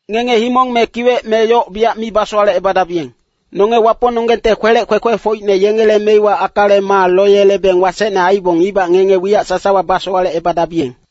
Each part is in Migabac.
“Ngenge himong me kiwec me yoc biyac mi basowalecebadabiyeng. Nonge Wapongnonggengte kwelec kwekwefocine yengele meiwa akale maa loyelebeng wasecne aibong ibac ngenge wiyac sasawa basowalecebadabiyeng.”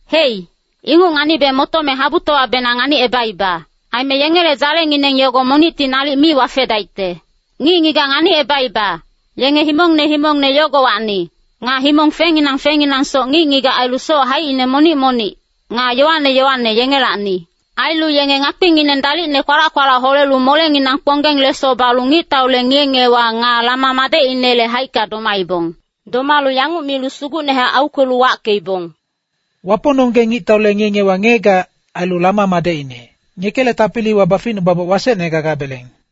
Hei, inguc nganibe motome habutowabenang nganicebaiba. Aime yengele dzalengineng yogo monicti nalic mi wafedaicte. Ngic-ngigac nganicebaiba, yenge himongne himongne yogowacni, nga himong fengnginang fengnginangsoc ngic-ngigac ailu soc haicine monic-monic, nga yowane yowane, yengelacni. Ailu yenge ngakpingineng dalicne kwalac-kwalac holelu molenginang kponggeng leso balu ngictaule ngiye-ngiyewa nga Lama madecinele haicka domaibong. Domalu yanguc milu sugucnehac aukwelu wackeibong, “Wapongnonggeng ngictaule ngiye-ngiyewa ngiyegac, ailu Lama madecine, ngekele tapiliwa baficnubaboc wasecne gagabeleng.”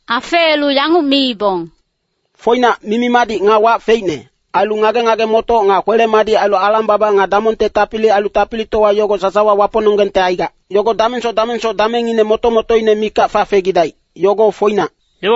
Afeelu yanguc miibong, “Foinac, mimi-madic nga wac feicne, ailu ngage-ngage-motoc nga kwele-madic ailu alang-baba nga damongte tapili ailu tapilitowa yogo sasawa Wapongnonggengte aigac. Yogo damengsoc damengsoc damengngine moto-motoine mikac fafegidaic, yogo foinac.”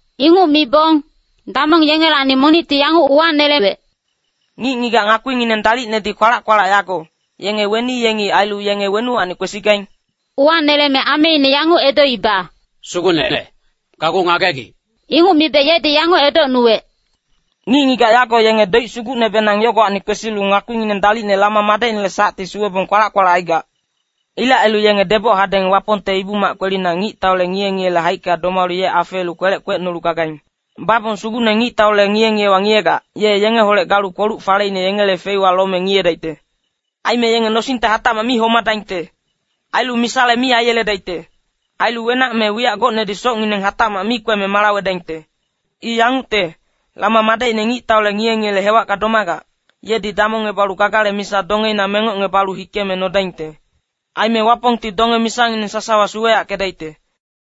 Inguc mibong, damong yengelacni monicti yanguc uwanelewec, “Ngic-ngigac ngakpingineng dalicnedi kwalac-kwalac yago, yenge weni yengi ailu yenge wenuwacni kwesigaing?” Uwaneleme ameine yanguc edoiba, “Sugucnene, gageuc ngagegic.” Inguc mibe yedi yanguc edocnuwec, “Ngic-ngigac yago yenge doic sugucnebenang yogowacni kwesilu ngakpingineng dalicne Lama madecinele sacti suwebong kwalac-kwalac aigac. Ilec ailu yenge deboc hadeng Wapongte Ibu-mac kwelina ngictaule ngiye-ngiyele haicka domalu ye afeelu kwelec kwecnolu gagaing. Babong Sugucne ngictaule ngiye-ngiyewa ngiyegac, ye yengeholec galu kpoluc-faleine yengele feiwa lome ngiyedaicte. Aime yenge nosingte hatacmac mi homadaingte. Ailu misale mi aiyeledaicte. Ailu wenac me wiyac gocnedi socngineng hatacmac mi kweme malawedaingte. I yangucte, Lama madecine ngictaule ngiye-ngiyele hewacka domagac, yedi damongebalu gagale misa dongeina mengocebalu hikeme nodaingte. Aime Wapongti donge-misangineng sasawa suweyackedaicte.”